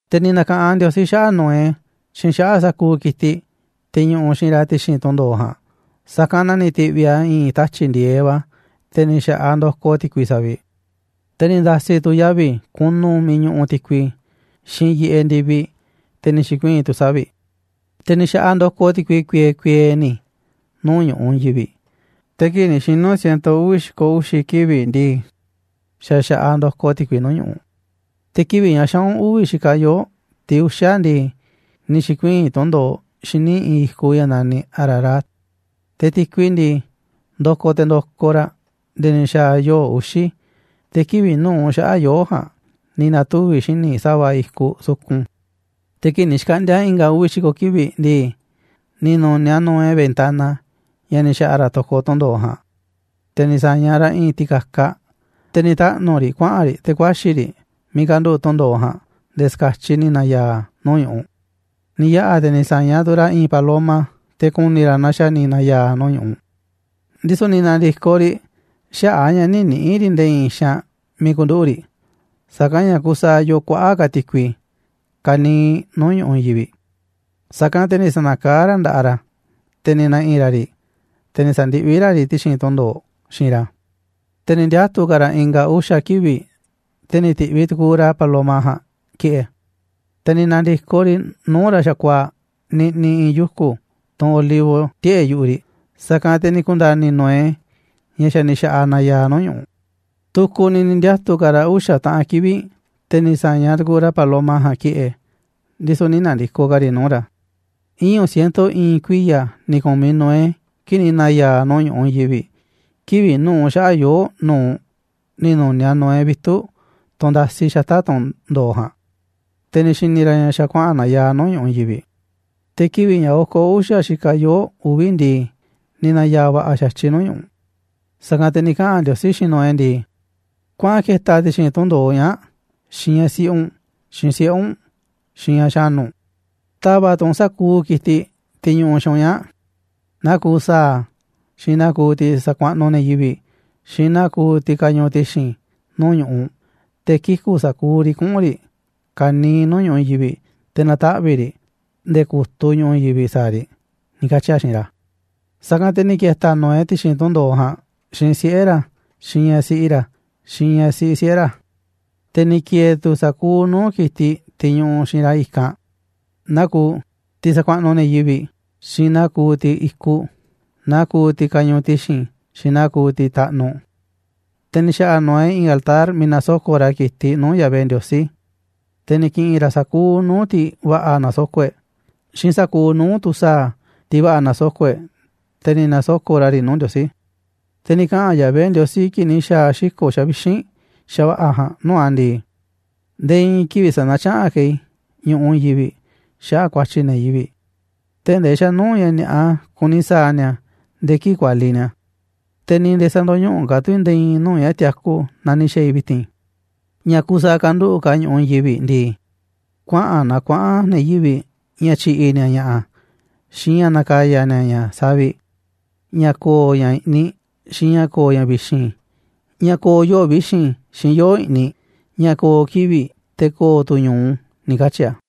Te̱ ni̱ na̱ka̱ꞌanꞌ Ndiosí xaꞌa̱ꞌ Noé xiinꞌ xaꞌa̱ꞌ sa̱kuuꞌ ki̱tiꞌ, tiꞌ ñuꞌuꞌ xiinꞌ ra̱ ti̱xi̱n tunꞌ ndo̱oꞌ ja̱a̱nꞌ, sa̱kanꞌ na ni̱ ti̱ꞌviꞌ a̱ i̱i̱n tatyi̱ꞌ ndi̱e̱eꞌ va̱, te̱ ni̱ xa̱ꞌaꞌ ndokoꞌ ti̱kui saviꞌ. Te̱ ni̱ nda̱si̱ tu̱ yavi̱ kunu miiꞌ ñuꞌuꞌ ti̱kui, xiinꞌ yiꞌeꞌ ndi̱viꞌ, te̱ ni̱ xi̱kuii̱n tu̱ savi̱ꞌ. Te̱ ni̱ xa̱ꞌaꞌ ndokoꞌ ti̱kui kuiee kuiee ni̱ nuu̱ꞌ ñu̱ꞌuꞌ i̱i̱n yivi̱ꞌ, te̱ kii̱ꞌ ni̱ xinu̱ ciento uvi̱ xi̱ko̱ uxi̱ kivi̱ꞌ ndii, xa̱ xa̱ꞌaꞌ ndokoꞌ ti̱kui nuu̱ꞌ ñu̱ꞌuꞌ. Te̱ kivi̱ꞌ ña̱ xaꞌu̱n uvi̱ xikaꞌ yoo̱ꞌ, tiꞌ uxa̱ ndii, ni̱ xi̱kuii̱n tunꞌ ndo̱oꞌ xíniꞌ i̱i̱n i̱kuꞌ ña̱ na̱niꞌ Ararat. Te̱ ti̱kui ndii, ndokoꞌ te̱ ndokoꞌ raꞌ nde̱e̱ ni̱ xa̱a̱ yoo̱ꞌ uxi̱, te̱ kivi̱ꞌ nu̱uꞌ xaꞌa̱ꞌ yoo̱ꞌ ja̱a̱nꞌ ni̱ na̱tuvi̱ xíniꞌ sa̱va̱ i̱kuꞌ sukun. Te̱ kii̱ꞌ ni̱ xkaꞌndi̱a̱ i̱nga̱ uvi̱ xi̱ko̱ kivi̱ꞌ ndii, ni̱ nu̱niaꞌ Noé ventana ña̱ ni̱ xa̱ꞌa̱ ra̱ to̱koꞌ tunꞌ ndo̱oꞌ ja̱a̱nꞌ, te̱ ni̱ sa̱ñaꞌ ra̱ i̱i̱n ti̱ka̱kaꞌ, te̱ ni̱ taꞌnu̱ riꞌ, kuaꞌa̱n riꞌ te̱ ku̱a̱xi̱ riꞌ miiꞌ kanduꞌu̱ꞌ tundo̱oꞌ ja̱a̱nꞌ nde̱e̱ ska̱tyiꞌ ni̱ na̱ya̱a̱ nuu̱ꞌ ñu̱ꞌuꞌ. Ni̱ yaꞌa̱ te̱ ni̱ sa̱ñaꞌ tu̱ ra̱ i̱i̱n paloma te̱ ku̱ni̱ ra̱ naaꞌ xa̱ ni̱ na̱ya̱a̱ nuu̱ꞌ ñu̱ꞌuꞌ. Ndisu̱ ni̱ na̱ndi̱koꞌ riꞌ xaꞌa̱ꞌ a̱ ña̱ nï̱ niꞌi̱ꞌ riꞌ nde̱e̱ i̱i̱n xaanꞌ miiꞌ ku̱nduꞌu̱ꞌ riꞌ, sa̱kanꞌ ña̱ kusaaꞌ yoo kuaꞌa̱ꞌ ka̱ ti̱kui ka̱niiꞌ nuu̱ꞌ ñu̱ꞌuꞌ i̱i̱n yivi̱ꞌ. Sa̱kanꞌ te̱ ni̱ sa̱na̱kaá ra̱ nda̱ꞌaꞌ ra̱, te̱ ni̱ na̱ꞌi̱ ra̱ riꞌ, te̱ ni̱ sa̱ndiꞌví ra̱ riꞌ ti̱xi̱n tunꞌ ndo̱oꞌ xiinꞌ ra̱. Te̱ ni̱ ndiatu̱ ka̱ ra̱ i̱nga̱ uxa̱ kivi̱ꞌ, te̱ ni̱ ti̱ꞌviꞌ tu̱ku̱u̱ ra̱ paloma ja̱a̱nꞌ ki̱ꞌe̱. Te̱ ni̱ na̱ndi̱koꞌ riꞌ nuu̱ꞌ ra̱ xa̱kuaa̱ꞌ niꞌniꞌ i̱i̱n yuku̱ tunꞌ olivo tiꞌe̱ꞌ yu̱ꞌuꞌ riꞌ, sa̱kanꞌ te̱ ni̱ ku̱nda̱ni̱ Noé ña̱ xa̱ ni̱ xa̱ꞌaꞌ nayaaꞌ nuu̱ꞌ ñu̱ꞌuꞌ. Tu̱ku̱ ni̱ ni̱ ndiatu̱ ka̱ ra̱ uxa̱ taꞌan kivi̱ꞌ, te̱ ni̱ sa̱ñaꞌ tu̱ku̱u̱ ra̱ paloma ja̱a̱nꞌ ki̱ꞌe̱, ndisu̱ nï̱ na̱ndi̱koꞌ ka̱ riꞌ nuu̱ꞌ ra̱. Iñu̱ ciento i̱i̱n kuiya̱ ni̱ ku̱miꞌ Noé kii̱ꞌ ni̱ na̱ya̱a̱ nuu̱ꞌ ñu̱ꞌuꞌ i̱i̱n yivi̱ꞌ. Kivi̱ꞌ nu̱uꞌ xaꞌa̱ꞌ yoo̱ꞌ nu̱uꞌ ni̱ nu̱niaꞌ Noé vitu̱ꞌ tunꞌ ndasi xata̱ꞌ tunꞌ ndo̱oꞌ ja̱a̱nꞌ, te̱ ni̱ xi̱ni̱ ra̱ ña̱ xa̱ kuaꞌa̱n nayaaꞌ nuu̱ꞌ ñu̱ꞌuꞌ i̱i̱n yivi̱ꞌ. Te̱ kivi̱ꞌ ña̱ oko̱ uxa̱ xikaꞌ yoo̱ꞌ uvi̱ ndii, ni̱ na̱ya̱a̱ va̱ꞌa̱ xa̱tyiꞌ nuu̱ꞌ ñu̱ꞌuꞌ. Sa̱kanꞌ te̱ ni̱ kaꞌa̱n Ndiosí xiinꞌ Noé ndii: ―Kuaꞌan ke̱ta̱ ti̱xi̱n tunꞌ ndo̱oꞌ ñaa̱ꞌ xiinꞌ ñaꞌ siꞌi u̱nꞌ, xiinꞌ siꞌe̱ u̱nꞌ, xiinꞌ ñaꞌ xa̱nu̱ u̱nꞌ. Ta̱va̱ꞌ tu̱ u̱nꞌ sa̱kuuꞌ ki̱tiꞌ, tiꞌ ñuꞌuꞌ xiinꞌ u̱nꞌ ñaa̱ꞌ: Naa kuuꞌ sa̱a̱, xiinꞌ naa kuuꞌ tiꞌ sakuaꞌnuꞌ ne̱ yivi̱ꞌ, xiinꞌ naa kuuꞌ tiꞌ kañuuꞌ ti̱xi̱n nuu̱ꞌ ñu̱ꞌuꞌ, te̱ kiku̱ sa̱kuuꞌ riꞌ kuꞌu̱n riꞌ ka̱niiꞌ nuu̱ꞌ ñu̱ꞌuꞌ i̱i̱n yivi̱ꞌ, te̱ na̱taꞌvi̱ꞌ riꞌ nde̱e̱ ku̱tuꞌ ñu̱ꞌuꞌ i̱i̱n yivi̱ꞌ sa̱a̱ riꞌ ―ni̱ katyi̱ a̱ xiinꞌ ra̱. Sa̱kanꞌ te̱ ni̱ ke̱ta̱ Noé ti̱xi̱n tunꞌ ndo̱oꞌ ja̱a̱nꞌ xiinꞌ siꞌe̱ ra̱, xiinꞌ ñaꞌ siꞌi ra̱, xiinꞌ ña̱ siꞌi siꞌe̱ ra̱. Te̱ ni̱ ki̱e̱e̱ tu̱ sa̱kuuꞌ nuu̱ꞌ ki̱tiꞌ, tiꞌ ñuꞌuꞌ xiinꞌ ra̱ i̱kanꞌ naa kuuꞌ: Tiꞌ sakuaꞌnuꞌ ne̱ yivi̱ꞌ, xiinꞌ naa kuuꞌ tiꞌ i̱kuꞌ, naa kuuꞌ tiꞌ kañuuꞌ ti̱xi̱n, xiinꞌ naa kuuꞌ tiꞌ taꞌnuꞌ. Te̱ ni̱ xa̱ꞌa̱ Noé i̱i̱n altar miiꞌ na̱soko̱ꞌ ra̱ ki̱tiꞌ nuu̱ꞌ Yahvé Ndiosí, te̱ ni̱ ki̱ꞌi̱n ra̱ sa̱kuuꞌ nuu̱ꞌ tiꞌ va̱ꞌa̱ na̱soko̱ꞌ e̱ꞌ, xiinꞌ sa̱kuuꞌ nuu̱ꞌ tu̱ sa̱a̱, tiꞌ va̱ꞌa̱ na̱soko̱ꞌ e̱ꞌ, te̱ ni̱ na̱soko̱ꞌ ra̱ riꞌ nuu̱ꞌ Ndiosí. Te̱ ni̱ kaꞌa̱n Yahvé Ndiosí kii̱ꞌ ni̱ xa̱a̱ xiko̱ xavixínꞌ xa̱va̱ꞌa̱ ja̱a̱nꞌ nuu̱ꞌ a̱ ndii: ―Nde̱e̱ i̱i̱n kivi̱ꞌ sä̱na̱tyaꞌanꞌ ka̱ i̱ ñu̱ꞌuꞌ i̱i̱n yivi̱ꞌ xaꞌa̱ꞌ ku̱a̱tyi̱ ne̱ yivi̱ꞌ, tee̱ꞌ ndee xa̱ nuu̱ꞌ ña̱ ni̱a̱ꞌa kuni sa̱a̱ ni̱a̱ nde̱e̱ kii̱ꞌ kualiꞌ ni̱a̱. Te̱ ni̱ nde̱e̱ sä̱ndo̱ñuꞌuꞌ ka̱ tu̱ i̱ nde̱e̱ i̱i̱n nuu̱ꞌ ña̱ tiaku naa ni̱ xa̱a̱ i̱ vi̱ti̱n. Ña̱ kuuꞌ saaꞌ kanduꞌu̱ꞌ ka̱ ñu̱ꞌuꞌ i̱i̱n yivi̱ꞌ ndii, kuaꞌa̱n na kuaꞌa̱n ne̱ yivi̱ꞌ ña̱ tyi̱ꞌi̱ ni̱a̱ ña̱ꞌa̱, xiinꞌ ña̱ na̱ka̱ya̱ ni̱a̱ ña̱ saviꞌ, ña̱ ko̱o̱ ña̱ i̱ꞌniꞌ xiinꞌ ña̱ ko̱o̱ ña̱ vi̱xi̱n, ña̱ ko̱o̱ yoo̱ꞌ vi̱xi̱n, xiinꞌ yoo̱ꞌ i̱ꞌniꞌ, ña̱ ko̱o̱ kivi̱ꞌ, te̱ ko̱o̱ tu̱ ñu̱u ―ni̱ katyi̱ a̱.